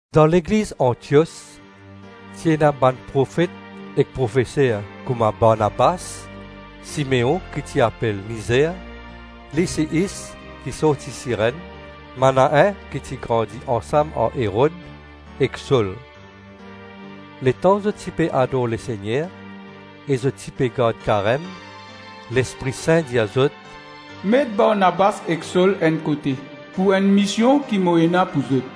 Dan Legliz Antios ti ena bann profet ek profeser kouma Barnabas, Simeon ki ti apel Nizer, Lisyis ki sorti Sirenn, Manaen ki ti grandi ansam ar Erod, ek Sol. Letan zot ti pe ador Lesegner e zot ti pe gard karem, Lespri Sin dir zot, “Met Barnabas ek Sol enn kote pou enn mision ki mo ena pou zot.”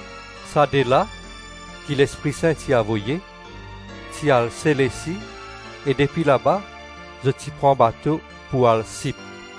Sa de la, ki Lespri Sin ti avoye, ti al Selesi e depi laba zot ti pran bato pou al Sip.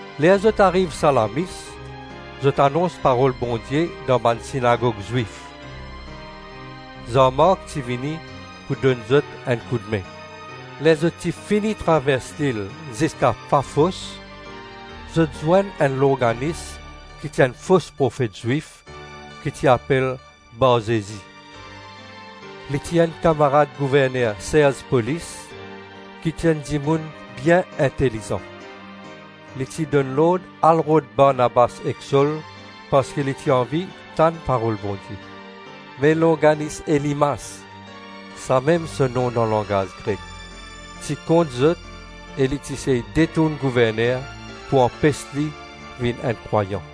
Ler zot ariv Salamis, zot anons parol Bondie dan bann sinagog Zwif. Zan Mark ti vini pou donn zot enn koudme. Ler zot ti fini travers lil ziska Pafos, zot zwenn enn longanis ki enn fos profet Zwif ki ti apel Barzezi. Li ti enn kamarad gouverner Serz Polis, ki ti enn dimoun bien intelizan. Li ti donn lord al rod Barnabas ek Sol parski li ti anvi tann parol Bondie. Me longanis Elimas - samem so nom dan langaz Grek - ti kont zot e li ti sey detourn gouverner pou anpes li vinn enn krwayan.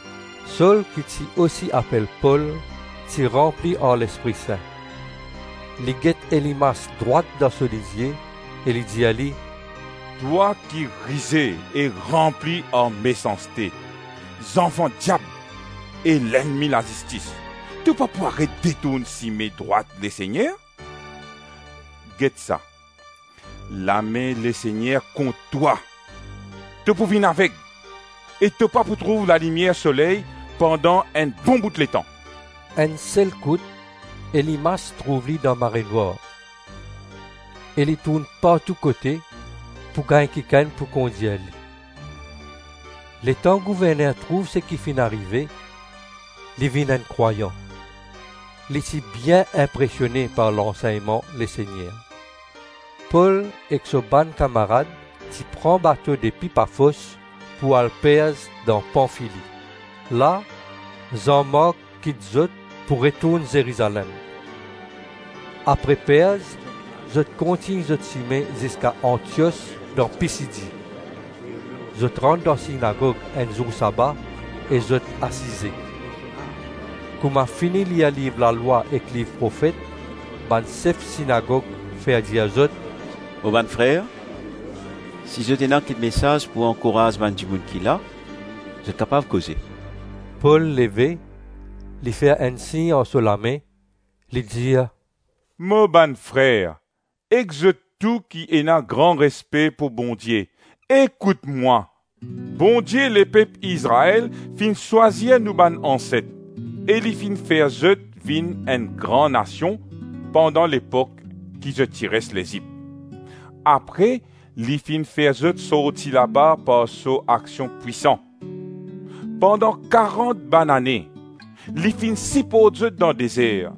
Sol, ki ti osi apel Pol, ti ranpli ar Lespri Sin. Li get Elimas drwat dan so lizie e li dir li, “Twa ki rize e ranpli ar mesanste, zanfan diab e lennmi lazistis, to pa pou aret detourn sime drwat Lesegner? Get sa! Lame Lesegner kont twa. To pou vinn aveg e to pa pou trouv lalimier soley pandan enn bon bout letan.” Enn selkout Elimas trouv li dan marenwar, e li tourn partou-kote, pou gagn kikenn pou kondir li. Letan gouverner trouv seki finn arive, li vinn enn krwayan. Li ti bien inpresione par lansegnman Lesegner. Pol ek so bann kamarad ti pran bato depi Pafos pou al Perz dan Panfili. La, Zan Mark kit zot pou retourn Zerizalem. Apre Perz zot kontign zot sime ziska Antios dan Pisidi. Zot rant dan sinagog enn zour saba e zot asize. Kouma fini lir liv Lalwa ek liv Profet, bann sef sinagog fer dir zot, “Mo bann frer, si zot ena kik mesaz pou ankouraz bann dimoun ki la, zot kapav koze.” Pol leve, li fer enn sign ar so lame, li dir, “Mo bann frer, ek zot tou ki ena gran respe pou Bondie, ekout mwa. Bondie lepep Izrael finn swazir nou bann anset, e li finn fer zot vinn enn gran nasion pandan lepok ki zot ti res Lezip. Apre li finn fer zot sorti laba par so aksion pwisan. Pandan karant banane li finn siport zot dan dezer.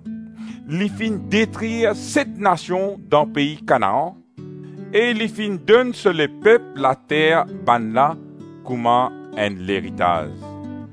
Li finn detrir set nasion dan pei Kanaan e li finn donn so lepep later bannla kouma enn leritaz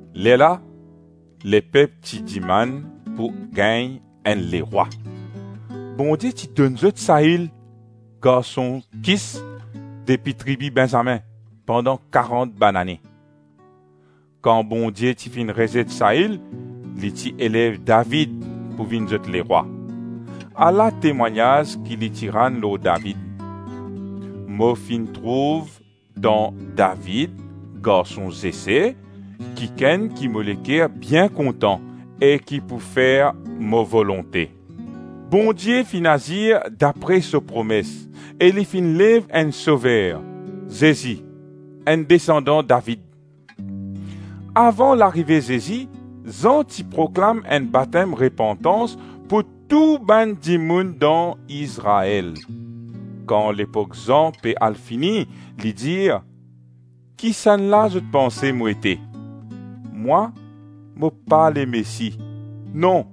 Lerla lepep ti dimann pou gagn enn lerwa. Bondie ti donn zot Sail, garson Kis depi tribi Benzamin, pandan karant banane. Kan Bondie ti finn rezet Sail, li ti elev David pou vinn zot lerwa. Ala temwagnaz ki li ti rann lor David: ‘Mo finn trouv dan David, garson Zese, kikenn ki mo leker bien kontan e ki pou fer mo volonte.’ Bondie finn azir dapre so promes e li finn lev enn Sover, Zezi, enn desandan David. Avan larive Zezi, Zan ti proklam enn batem repantans pou tou bann dimoun dan Izrael. Kan lepok Zan pe al fini, li dir, ‘Kisannla zot panse mo ete? Mwa, mo pa Lemesi. Non,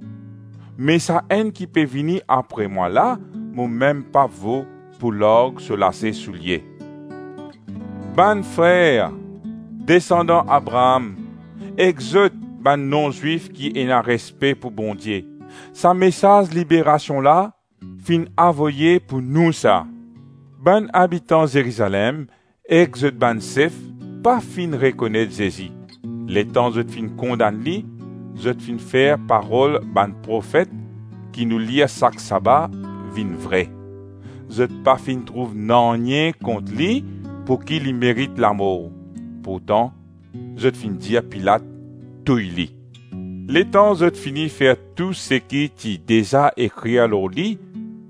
me Sa-Enn ki pe vini apre mwa la, mo mem pa vo pou larg so lase soulie.’ Bann frer, desandan Abraam ek zot bann non-Zwif ki ena respe pou Bondie, sa mesaz liberasion la, finn avoye pou nou sa. Bann abitan Zerizalem ek zot bann sef pa finn rekonet Zezi; letan zot finn kondann li, zot finn fer parol bann profet ki nou lir sak saba vinn vre. Zot pa finn trouv nanye kont li pouki li merit lamor, pourtan zot finn dir Pilat touy li. Letan zot finn fer tou seki ti deza ekrir lor li,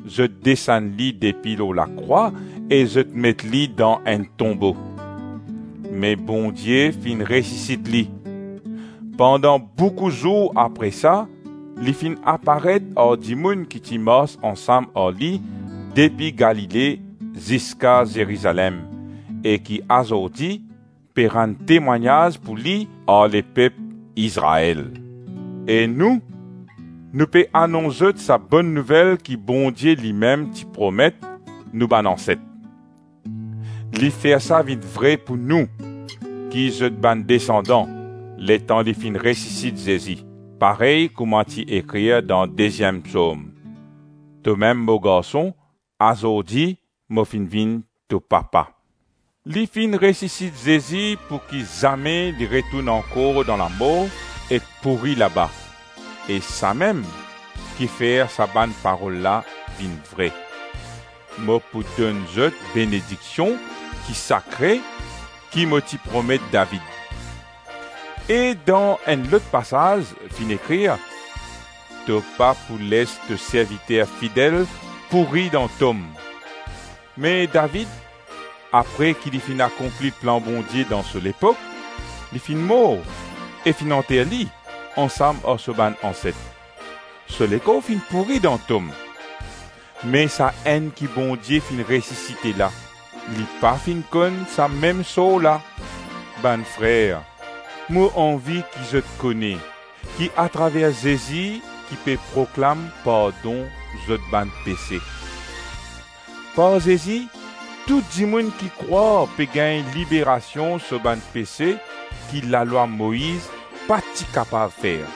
zot desann li depi lor lakrwa e zot met li dan enn tonbo. Me Bondie finn resisit li. Pandan boukou zour apre sa, li finn aparet ar dimoun ki ti mars ansam ar li depi Galile ziska Zerizalem, e ki azordi pe rann temwagnaz pou li ar lepep Izrael. E nou, nou pe anons zot sa Bonn Nouvel ki Bondie limem ti promet nou bann anset. Li fer sa vinn vre pou nou, ki zot bann desandan, letan li finn resisit Zezi; parey kouma ti ekrir dan deziem Psom: ‘Tomem mo Garson, Azordi mo finn vinn to Papa.’ Li finn resisit Zezi pouki zame li retourn ankor dan lamor ek pouri laba, e samem ki fer sa bann parol la vinn vre: ‘Mo pou donn zot benediksion ki sakre ki mo ti promet David.’ E dan enn lot pasaz finn ekrir: ‘To pa pou les to serviter fidel pouri dan tom.’ Me David, apre ki li finn akonpli plan Bondie dan so lepok, li finn mor e finn anter li ansam ar so bann anset. So lekor finn pouri dan tom. Me Sa-Enn ki Bondie finn resisite la, li pa finn konn sa mem sor la. Bann frer, mo anvi ki zot kone ki atraver Zezi ki pe proklam pardon zot bann pese. Par Zezi tou dimoun ki krwar pe gagn liberasion so bann pese ki lalwa Moiz pa ti kapav fer.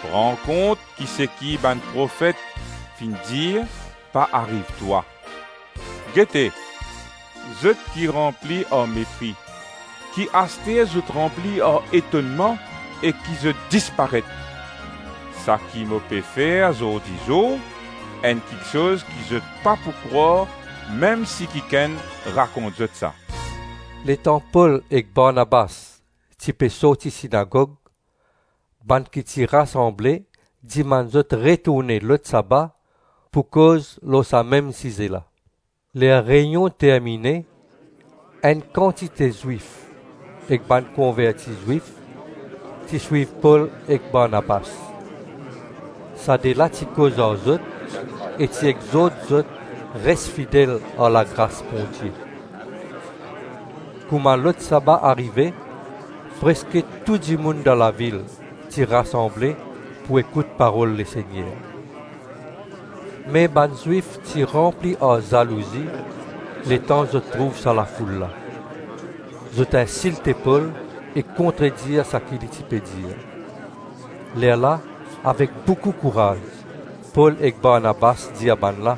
Pran kont ki seki bann profet finn dir pa ariv twa: ‘Gete, zot ki ranpli ar mepri, ki aster zot ranpli ar etonnman e ki zot disparet! Saki mo pe fer zordi zour enn kiksoz ki zot pa pou krwar mem si kikenn rakont zot sa.’” Letan Pol e Barnabas ti pe sorti sinagog, bann ki ti rasanble dimann zot retourne lot saba pou koz lor sa mem size la. Ler reynion termine, enn kantite Zwif ek bann konverti Zwif ti swiv Pol ek Barnabas. Sa de la ti koz ar zot e ti exort zot res fidel ar lagras Bondie. Kouma lot saba arive preske tou dimoun dan lavil ti rasanble pou ekout parol Lesegner. Me bann Zwif ti ranpli ar zalouzi letan zot trouv sa lafoul la. Zot insilte Pol e kontredir saki li ti pe dir. Lerla avek boukou kouraz Pol ek Barnabas dir bannla,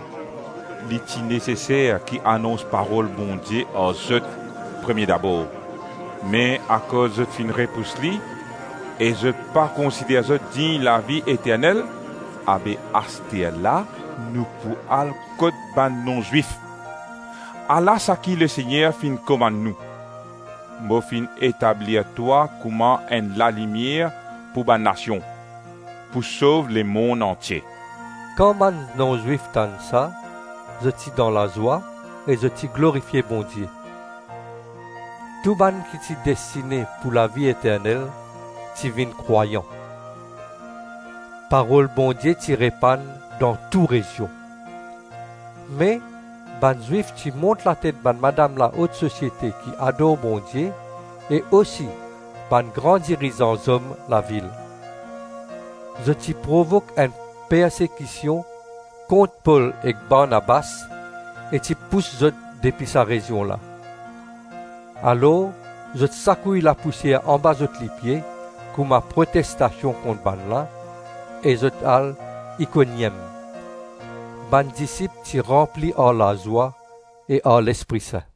“Li ti neseser ki anons parol Bondie ar zot premie dabor. Me akoz zot finn repous li e zot pa konsider zot dign lavi eternel, abe asterla nou pou al kot bann non-Zwif. Ala saki Lesegner finn komann nou: ‘Mo finn etablir twa kouma enn lalimier pou bann nasion, pou sov lemonn antie.’” Kan bann non-Zwif tann sa, zot ti dan lazwa e zot ti glorifie Bondie. Tou bann ki ti destine pou lavi eternel ti vinn krwayan. Parol Bondie ti repann dan tou rezion. Me bann Zwif ti mont latet bann madam laot sosiete ki ador Bondie e osi bann gran dirizan zom lavil. Zot ti provok enn persekision kont Pol ek Barnabas, e ti pous zot depi sa rezion la. Alors zot sakouy lapousier anba zot lipie kouma protestasion kont bannla, e zot al Ikoniem. Bann disip ti ranpli ar lazwa e ar Lespri Sin.